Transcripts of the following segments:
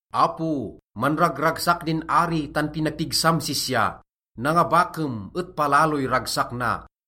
Apo, manragragsak din ari tan pinapigsam sisya, nangabakem et palaloy ragsak na.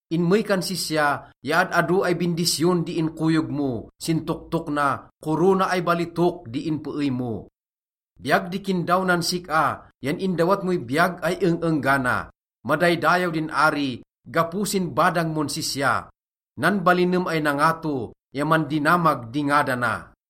Inmey kan sisya ya ad-ado ay bindisyon di inkoyog mo, sin toktok na, korona ay balitok di inpeey mo. Biyag di kindaw nan sik-a, yan indawat moy biyag ay eng-enggana. Madaydayaw din ari gapo sin badang mon sisya, nanbalinem ay nangato ya mandinamag di ngadana.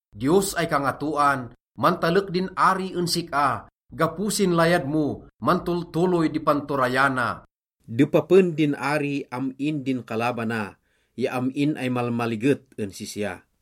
Diyos ay Kangatoan, mantalek din ari en sik-a, gapo sin layad mo, mantoltoloy di panturayana. Depapen din ari am-in din kalabana ya am-in ay malmaliget en sisya.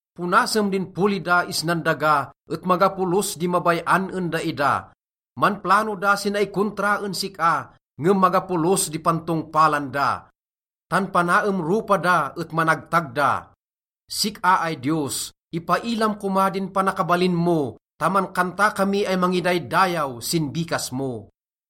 Ponasem din poli da isnan daga et maga polos di mabay-an en daida. Manplano da si naikontra en sik-a, ngem maga polos di pantongpalan da, tan panaem ropa da et managtag da. Sik-a ay Diyos, ipailam koma din panakabalin mo, ta mankanta kami ay mangidaydayaw sin bikas mo.